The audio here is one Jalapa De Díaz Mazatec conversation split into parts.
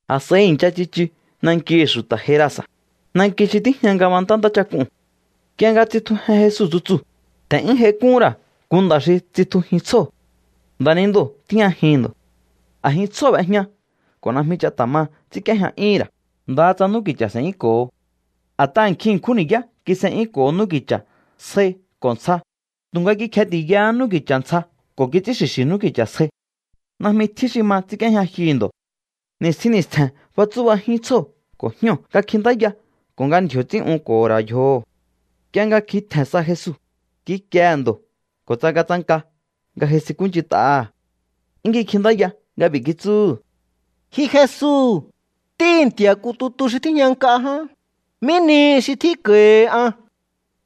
A̱s'a̱i i̱ncha tsichu nankihi̱ xu̱ta̱ Gerasa̱, nanki xi tíjña ngabantá ntáchak'uu̱n. Nk'ie nga tsitjujen Jesu tsutsuu̱, tje̱n'yún j'aik'úhún ra̱ nku nda̱ xi tsitjujin tsjóo̱. Nda̱nindoo̱ tíjñajihi̱n ndo̱. A̱jin tsjóo̱ b'ejña ko̱ najmi ch'a ta̱ ma ts'ínk'íéjña'yúhu̱n ra̱, ndaha tsa n'úki̱cha̱ s'e̱'yúnko̱ho. A̱t'aha̱ nkjin ṉkjún ni̱yá kis'e'yúnko̱ho n'úki̱cha̱ sjai ko̱ ntsja, tu̱nga kikjeti̱yahá n'úki̱cha̱ ntsja ko̱ kits'ín xi̱xi̱ n'úki̱cha̱ sjai. Najmi tjín xi ma ts'ínk'íéjña jyuhu̱ ndo̱. Ni̱stjin ni̱stje̱n fatsú'bajín tsjóo̱ ko̱ jñóo̱ nga kjintáya ko̱ nga ndji̱o̱ ts'ín'unko̱ho̱ ra̱ yjoho̱. Nk'ie nga kjin tje̱n sa Jesu, kikiehe̱ ndo̱ ko̱ tsangatsanka nga j'aisinkúnch'int'aha̱. 'Yún kikjintáya nga b'i̱ kitsúhu̱: —Ji Jesu, Ntíhi̱ Nti̱a̱ nku tutu xi tíjña nk'a ján, ¿mí nihi xi tjínko̱hi an?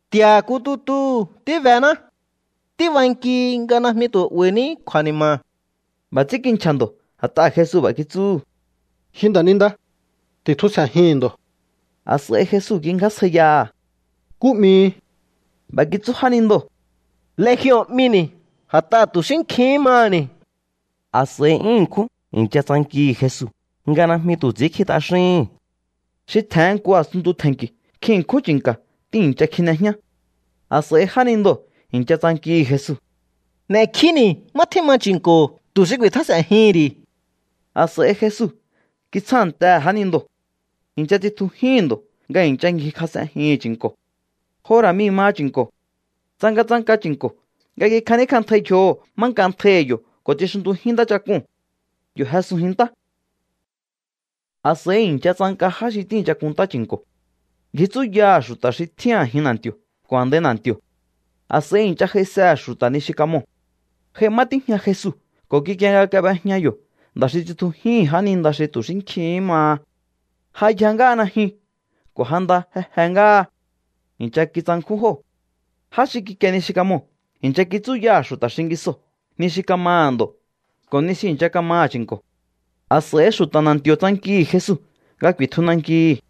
Nti̱a̱ nku tutuu̱ tíbená. Tíbankihi nga najmi tu̱ 'ba̱i̱ní kju̱a̱ni̱ma̱. B'a̱ ts'ín kinchja̱ ndo̱ a̱t'aha̱ Jesu b'a̱ kitsúhu̱: —¡Ji nda̱ninda, ti̱tjusje̱jihi̱n ndo̱! A̱s'a̱i Jesu kingjásjaiyaha̱: —¿Nkú 'mihi? B'a̱ kitsú jánindoo̱: —Legion 'mini̱ a̱t'aha̱ tu̱ xí nkjihín maha̱ni̱. A̱s'a̱i 'yún ṉkjún i̱ncha tsankihi̱ Jesu nga najmi tu̱ ts'i̱ínkji t'axíhi̱n. Xi tje̱hen nku a̱sunntu tje̱nki̱ nkjin ṉkjún chi̱nka̱ tíi̱ncha kjine jñá. A̱s'a̱i jánindoo̱ i̱ncha tsankihi̱ Jesu: —N'e̱kjíni̱ má tjíma chi̱nko̱ tu̱ xi ku̱i̱tjás'e̱njihi̱n ri̱. A̱s'a̱i Jesu kitsjántehe̱ jánindoo̱. I̱ncha tsitjujíhi̱n ndo̱ nga i̱ncha ngjikjas'enjihi̱n chi̱nko̱. Jo ra̱ mii̱ maha chi̱nko̱. Tsangatsanka chi̱nko̱ nga kikjaníkj'antjai yjoho̱ má nk'antjaihi̱ yo̱ ko̱ tsixuntujín ntáchak'uu̱n. Yo̱ jesunjin ntá. A̱s'a̱i i̱ncha tsanka já xi tíi̱ncha kunntá chi̱nko̱. Ngji tsúyaha̱ xu̱ta̱ xi tjín a̱jin na̱nti̱o̱ ko̱ a̱ndai na̱nti̱o̱. A̱s'a̱i i̱ncha j'aisehe̱ xu̱ta̱ ni xi kamoo̱. J'ai má tíjña Jesu ko̱ kikie nga kab'ejña yo̱ nda̱ xi tsitjujíhi̱n jáninda xi tu̱ xí nkjihín maha. Ja yja ngáha najyun ko̱ ja nda je je ngáha. I̱ncha kitsankjún jóo̱. Já xi kikie ni xi kamoo̱ i̱ncha kitsúyaha̱ xu̱ta̱ xingisoo̱ ni xi kamaha̱ ndo̱ ko̱ ni xi i̱ncha kamaha̱ chi̱nko̱. A̱s'a̱i xu̱ta̱ na̱nti̱o̱ tsankihi̱ Jesu nga ku̱i̱tju nankihi̱.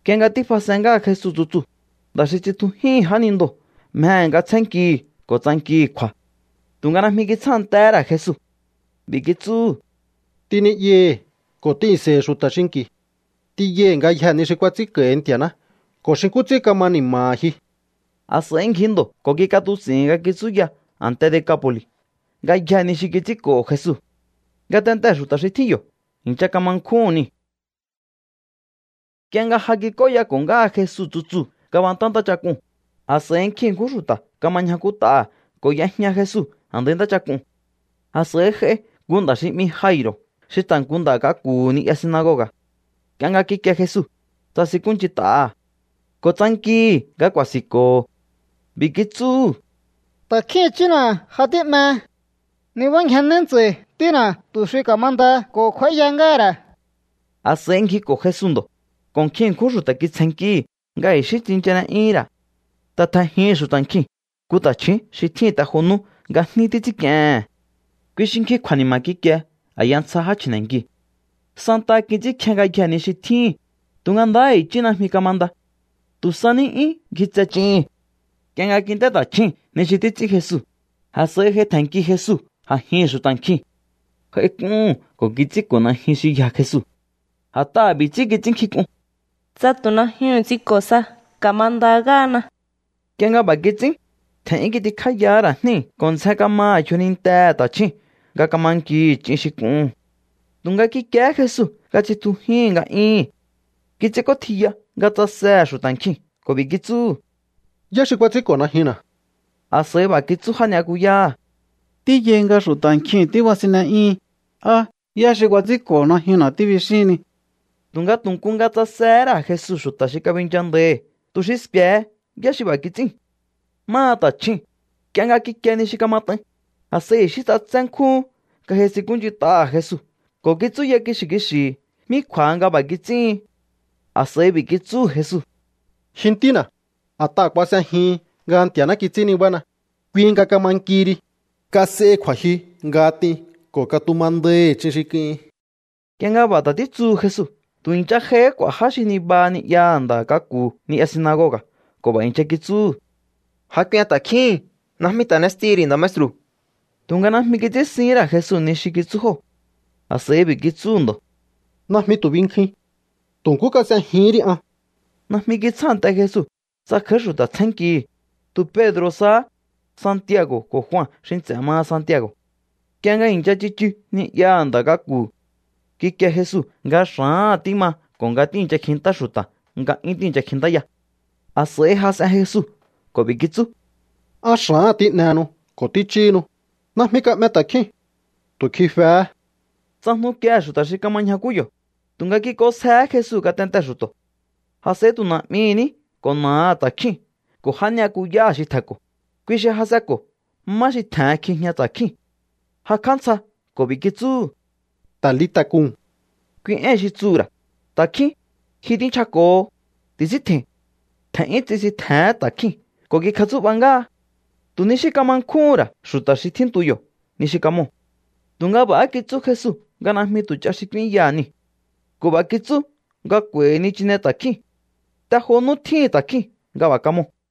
Nk'ie nga tífas'en ngáha Jesu tsutsuu̱, nda̱ xi tsitjujíhi̱n jánindoo̱ mjehe̱ nga tsjénnkihi̱ ko̱ tsankihi̱ kju̱a̱. Tu̱nga najmi kitsjántehé ra̱ Jesu. B'i̱ kitsúhu̱: —T'in ni'yahi̱ ko̱ t'ihi̱nse̱i̱hi̱ xu̱ta̱ xinki̱. T'inyaihi̱ ngayjee̱ ni xi kuats'ínko̱hi Nti̱a̱ná ko̱ xi nkú ts'ín kama ni̱ma̱ha̱ ji. A̱s'a̱i ngji ndo̱ ko̱ kik'atuts'i̱hi̱n nga kitsúya a̱nte Decapo̱li̱ ngayjee̱ ni xi kits'ínko̱ho̱ Jesu. Ngatentee̱ xu̱ta̱ xi tjín yo̱ i̱ncha kama nkjúhu̱n niu̱. Nk'ie nga ja kik'óyako̱ ngáha Jesu tsutsuu̱ ngabantá ntáchak'uu̱n, a̱s'a̱i nkjin ṉkjún xu̱ta̱ kama ñjakút'aha̱ ko̱ y'ejña Jesu a̱ndai ntáchak'uu̱n. A̱s'a̱i j'ai nku nda̱ xi 'mi Jairo̱ xi ta̱ nku nda̱ k'aku̱hu̱ ni'ya sinagoga̱. Nk'ie nga kikie Jesu, tsasinkúnch'int'aha̱ ko̱ tsankihi̱ nga ku̱a̱si̱nko̱ho̱. B'i̱ kitsúhu̱: —Ta̱kjín i̱chína̱ ja tí'me. Nibángjennéí ntsa̱i̱ ntína̱ tu̱ xi ka̱mandaha ko̱ kj'u̱a̱íya ngáha̱ ra̱. A̱s'a̱i ngjiko̱ Jesu ndo̱, ko̱ nkjin ṉkjún xu̱ta̱ kitsjennkíhi̱ nga i̱xí tsinchane'yúhún ra̱. Ta̱ tje̱njihi̱n xu̱ta̱ nkjiu̱n nku ta̱chju̱ún xi tjíhi̱n te jo nú nga jní títs'ínk'iehe̱n. Kui xi nkjin kju̱a̱ni̱ma̱ kikie a̱ya ntsja já chji̱ne̱nkiu̱. Santaha kits'ínkje ngayjee̱ ni xi tjíhín, tu̱nga ndahá i̱chí najmi kamanda. Tu̱ sa ní 'yún ngjitse ch'ihi̱n. Nk'ie nga kint'é ta̱chjúu̱n ni xi títs'ín Jesu, a̱s'a̱i j'ai tje̱nnki Jesu a̱jihi̱n xu̱ta̱ nkjiu̱n. J'aik'úhu̱n ko̱ kits'ínko̱ najyun xi yja Jesu. A̱t'aha̱ b'i̱ ts'ín kits'ínnkjink'un: “Tsa tu̱ najyuhu̱n ts'inko̱ sa, ka̱manda ngáhana.” Nk'ie nga b'a̱ kits'ín, tje̱n'yún kitikjáyahá ra̱ jníu̱ ko̱ ndzjen kamaha̱ yjonintehe̱ ta̱chjúu̱n nga kama nkihi̱ ch'in xi k'uhu̱n. Tu̱nga kikiehé Jesu nga tsitjujíhi̱n nga'yún. Kits'ínk'ótjiya nga tsasehe̱ xu̱ta̱ nkjiu̱n ko̱ b'i̱ kitsúhu̱: —¿Yá xi kuats'ínko̱ najyunna̱? A̱s'a̱i b'a̱ kitsú já ni'yakuyáha̱: —Tíyai nga xu̱ta̱ nkjiu̱n tíbasinne'yíhin. Á: “¿Yá xi kuats'ínko̱ najyunna̱?”, tíbixíhinni. Tu̱nga tu̱ nku nga tsasehé ra̱ Jesu xu̱ta̱ xi kabinchandaihi̱ tu̱ xi sku̱e̱he yá xi b'a̱ kits'íu̱n. Máha ta̱chjúu̱n, nk'ie nga kikie ni xi kamat'ain, a̱s'a̱i i̱xí ts'atsé nkjúhún nga j'aisinkúnch'int'aha̱ Jesu ko̱ kitsúya kixi̱ kixi̱hi̱ mí kju̱a̱ha nga b'a̱ kits'íhin. A̱s'a̱i b'i̱ kitsúhu̱ Jesu: —Ji ntína̱, a̱t'aha̱ kuas'ejihin nga Nti̱a̱ná kits'ín nibána, kui nga kama nkihi ri. Kas'ehi kju̱a̱jyu nga t'in ko̱ katumandaihi̱ ch'in xi k'uhin. Nk'ie nga b'a̱ ta̱ títsuhu Jesu, tu̱ i̱ncha j'aihí k'u̱a̱ já xi nibaha ni'yaha̱ nda̱ k'aku̱hu̱ ni'ya sinagoga̱ ko̱ b'a̱ i̱ncha kitsúhu̱: —Ja k'uen ta̱kjíhi̱n. Najmi ta̱ n'estihi̱ ri̱ nda̱ maestru̱. Tu̱nga najmi kits'ínsihín ra̱ Jesu ni xi kitsú jóo̱. A̱s'a̱i b'i̱ kitsúhu̱ ndo̱: —Najmi tu̱ binkjuin. Tu̱ nkú kas'ejihín ri an. Najmi kitsjánte Jesu tsa kj'a̱í xu̱ta̱ tsjénnkihi̱, tu̱ Pedro̱ sahá, Santiago̱ ko̱ Jua xi nts'e̱ maha Santiago̱. Nk'ie nga i̱ncha tsichu ni'yaha̱ nda̱ k'aku̱, kikie Jesu nga xa̱áha̱n tíma ko̱ nga tíi̱ncha kjintá xu̱ta̱ nga 'yún tíi̱ncha kjintáya. A̱s'a̱i jas'en Jesu ko̱ b'i̱ kitsú: —¿Á xa̱áha̱n tín'ehenu ko̱ tích'íhinu? Najmi ka'me ta̱kjíu̱n. Tu̱ kjifehé. Tsajnukiehe̱ xu̱ta̱ xi kama ñjakú yo̱, tu̱nga kik'onsjehé Jesu ngatentee̱ xu̱to̱. A̱s'a̱i tu̱ na̱'mihi̱ ní ko̱ na̱aha̱ ta̱kjíu̱n ko̱ já ni'yakuyáha̱ xi tje̱nko̱, kui xi jas'enko̱ má xi tje̱hen kjijña ta̱kjíu̱n. Jakj'á ntsja ko̱ b'i̱ kitsúhu̱: —Talita̱, kuu̱m —kui éi̱n xi tsuhu̱ ra̱: Ta̱kjín, ji tínchjako̱ho, ti̱síntje̱i̱n. Tje̱n'yún tsisintje̱hén ta̱kjíu̱n ko̱ kikjatsú'ba ngáha. Tu̱ ni xí kama nkjúhu̱n ra̱ xu̱ta̱ xi tjíntu yo̱ ni xi kamoo̱. Tu̱nga b'a̱há kitsú Jesu nga najmi tu̱ ch'a xi k'úínyaha̱ niu̱. Ko̱ b'a̱ kitsú nga k'u̱a̱i̱hi̱ nichine ta̱kjíu̱n. Te jo nú tjíhi̱n ta̱kjíu̱n nga b'a̱ kamoo̱.